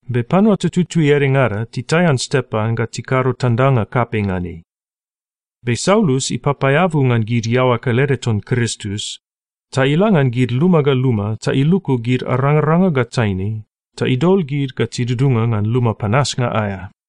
Be panua tututui edengada titaian Stepan ga tikado tandanga kapei ngan ei. Be Saulus ipapaeabu ngan gid iaoa kelede ton Kristus, ta ila ngan gid luma ga luma ta iluku gid arangaranga ga taine, ta idol gid ga tidudunga ngan luma panasnga aea.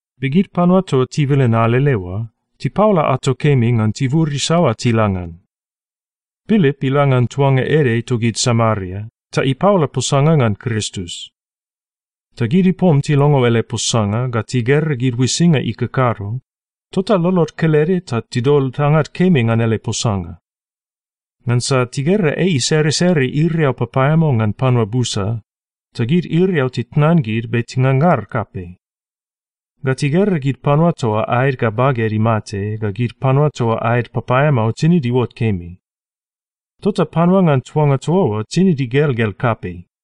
Be gid panua toa tibilin alele oa, tipaola ato kemi ngan tibur isaoa tila ngan. Pilip ila ngan tuanga ede togid Samaria, ta ipaola posanga ngan Kristus. Ta gid ipom tilongo ele posanga ga tigera gid uisinga ikakado, tota lolod kelede ta tidol tangad kemi ngan ele posanga. Ngansa tigera ei iseresere iriau papaeamao ngan panua busa, ta gid iriau titnan gid be tingangar kapei. Ga tigera gid panua toa aed ga baged imate ga gid panua toa aed papaeamao tinid iuot kemi. Tota panua ngan tuanga toa oa tinid igelgel kapei.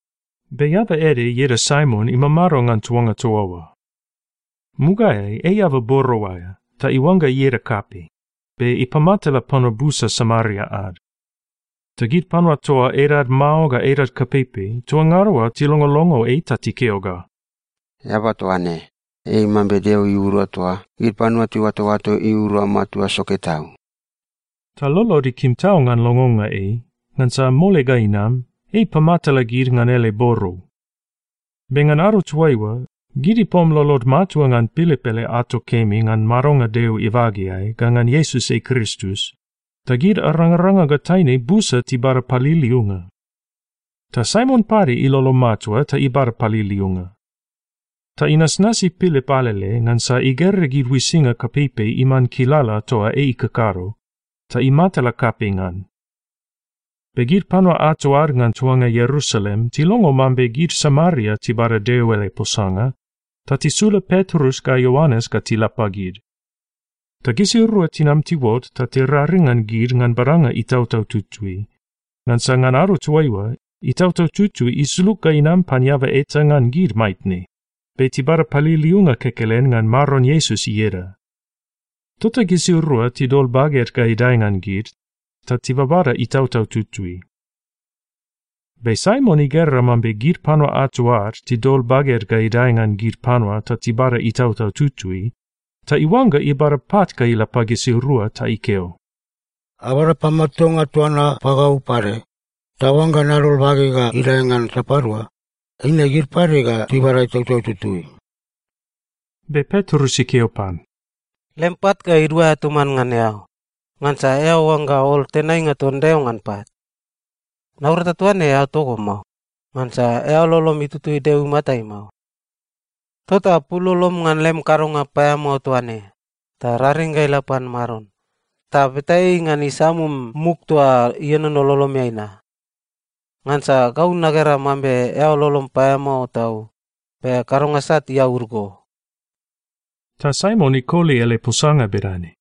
Be eaba ede ieda Saimon imamado ngan tuanga toa oa. Mugaeai ei eaba borou aea, ta iuangga ieda kapei, be ipamatala panua busa Samaria ad. Ta gid panua toa edad mao ga edad kapeipei toa ngada oa tilongolongo ei ta tikeo ga, “Eaba toa ne, ei mambe Deo iura toa gid panua tiuatoato iura matua soke tau.” Ta lolod ikim tau ngan longonga ei, ngansa mole ga inam, ei ipamatala gid ngan ele borou. Be ngan ado toaiua, gid ipom lolod matua ngan Pilip ele ato kemi ngan madonga Deo ibageai ga ngan Iesus ei Kristus, ta gid arangaranga ga taine busa tibada paliliunga. Ta Saimon pade ilolo matua ta ibada paliliunga. Ta inasnasi Pilip alele, ngansa igera gid uisinga kapeipei iman kilala toa ei ikakado, ta imatala kapei ngan. Be gid panua ato ad ngan tuanga Ierusalem tilongo mambe gid Samaria tibada Deo ele posanga, ta tisula Petrus ga Ioanes ga tila pagid. Ta gisirua tinam tiuot ta tiraring ngan gid ngan badanga Itautau Tutui, ngansa ngan ado toaiua, Itautau Tutui isulug ga inam pan eaba eta ngan gid maitne, be tibada paliliunga kekelen ngan Maron Iesus ieda. Tota gisirua tidol baged ga idae ngan gid, ta tibabada Itautau Tutui. Be Saimon igera mambe gid panua ato ad tidol baged ga idae ngan gid panua ta tibada Itautau Tutui, ta iuangga ibada pat ga ila pagisirua ta ikeo, “Abada pamatuanga toa na pagau pade, ta oangga nadol bageg ga idae ngan sapadua, eine gid pade ga tibada Itautau Tutui.” Be Petrus ikeo pan, “Lem pat ga iduaea toman ngan eao, ngansa eao oangga ol tenainga ton Deo ngan pat! Naurata toa ne eao togo mao, ngansa eao lolom itutui Deo imatai mao. Tota pul lolom ngan lem kadonga paeamao toa ne, ta raring ga ila pan Maron, ta beta ei ngan isamum muk toa ienono lolomeai na. Ngansa gau nagera mambe eao lolom paeamao tau, be kadonga sat iaud go.” Ta Saimon ikoli ele posanga bedane,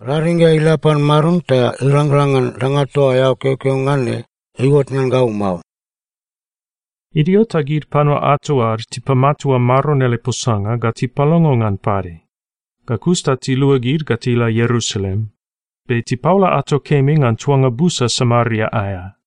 “Raring ga ila pan Maron ta irangrang ngan danga toa eao keokeo ngan ne iuot ngan gau mao.” Idio ta gid panua ato ad tipamatua Maron ele posanga ga tipalongo ngan pade, ga kus ta tiluagid ga tila Ierusalem, be tipaola ato kemi ngan tuanga busa Samaria aea.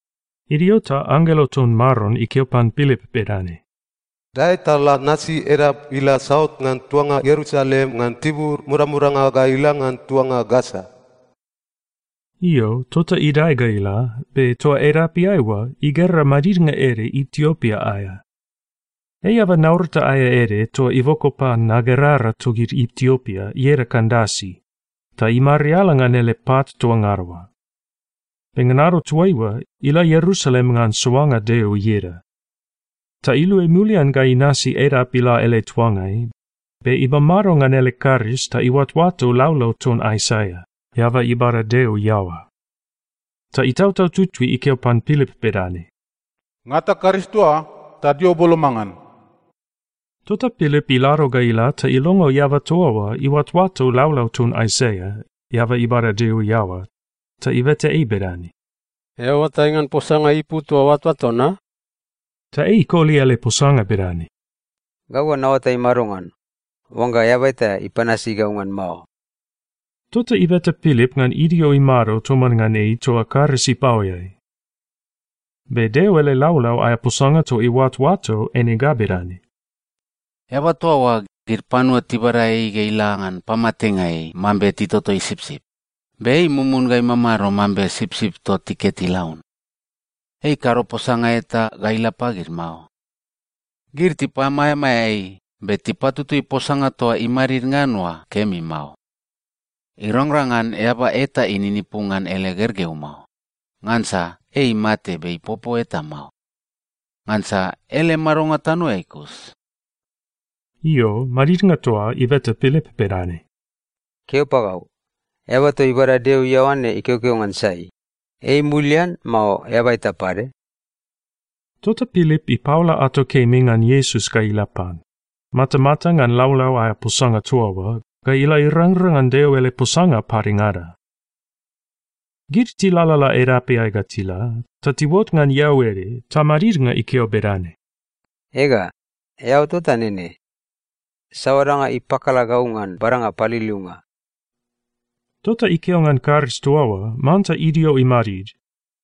Idio ta anggelo ton Maron ikeo pan Pilip bedane, “Dae ta la nasi edap ila saut ngan tuanga Ierusalem ngan tibur modamodanga ga ila ngan tuanga Gasa.” Io, tota idae ga ila, be toa edapeai oa igera madidnga ede Itiopia aea. Ei eaba naurata aea ede toa iboko pan nagerara togid Itiopia ieda Kandasi, ta imariala ngan ele pat toa ngada oa. Be ngan ado toaiua, ila Ierusalem ngan soanga Deo ieda. Ta iluai mulian ga inasi edap ila ele tuangai, be imamado ngan ele karis ta iuatoato laulau ton Aisaia, eaba ibada Deo iaoa. Ta Itautau Tutui ikeo pan Pilip bedane, “Ngata karis toa oa, ta dio boloma ngan.” Tota Pilip ilado ga ila ta ilongo eaba toa oa iuatoato laulau ton Aisaia, eaba ibada Deo iaoa, ta ibeta ei bedane, “Eao oatai ngan posanga ipu toa oatoato na?” Ta ei ikoli ele posanga bedane, “Gau ga naoatai madongan, oangga eaba eta ipanasi gau ngan mao?” Tota ibeta Pilip ngan idio imado toman ngan ei toa karis ipaoeai. Be Deo ele laulau aea posanga toa iuatoato eine ga bedane, “Eaba toa oa, gid panua tibada ei ga ila ngan pamatenga ei mambe titotoi sipsip, be ei mumun ga imamado mambe sipsip toa tiket ilaun. Ei ikado posanga eta ga ila pagid mao. Gid tipamaeamaea ei, be tipatutui posanga toa imadid ngan oa kemi mao. Irangrang ngan eaba eta ininipu ngan ele gergeu mao, ngansa ei imate be ipopo eta mao. Ngansa ele madonga tanoeai kus.” Io, madidnga toa ibeta Pilip bedane, “Keo pagau, eaba toa ibada Deo iaoa ne ikeokeo ngan sai, ei mulian, mao eaba eta pade?” Tota Pilip ipaola ato kemi ngan Iesus ga ila pan, matamata ngan laulau aea posanga toa oa, ga ila irangrang ngan Deo ele posanga padengada. Gid tilalala edapeai ga tila, ta tiuot ngan eau ede, ta madidnga ikeo bedane, “Ega, eau tota nene. Saoa danga ipakala gau ngan badanga paliliunga?” Tota ikeo ngan karis toa oa manta idio imadid,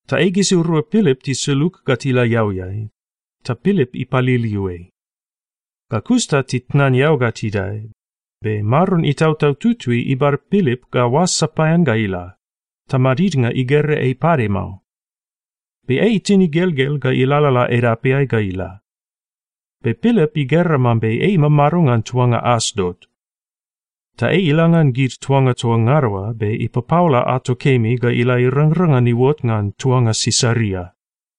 ta ei gisirua Pilip tisulug ga tila eauiai, ta Pilip ipaliliu ei. Ga kus ta titnan eau ga tidae, be Maron Itautau Tutui ibada Pilip ga oas sapaean ga ila, ta madidnga igera ei pade mao. Be ei itin igelgel ga ilalala edapeai ga ila. Be Pilip igera mambe ei imamado ngan tuanga Asdot. Ta ei ila ngan gid tuanga toa ngada oa be ipapaola ato kemi ga ila irangrang ngan iuot ngan tuanga Sisaria.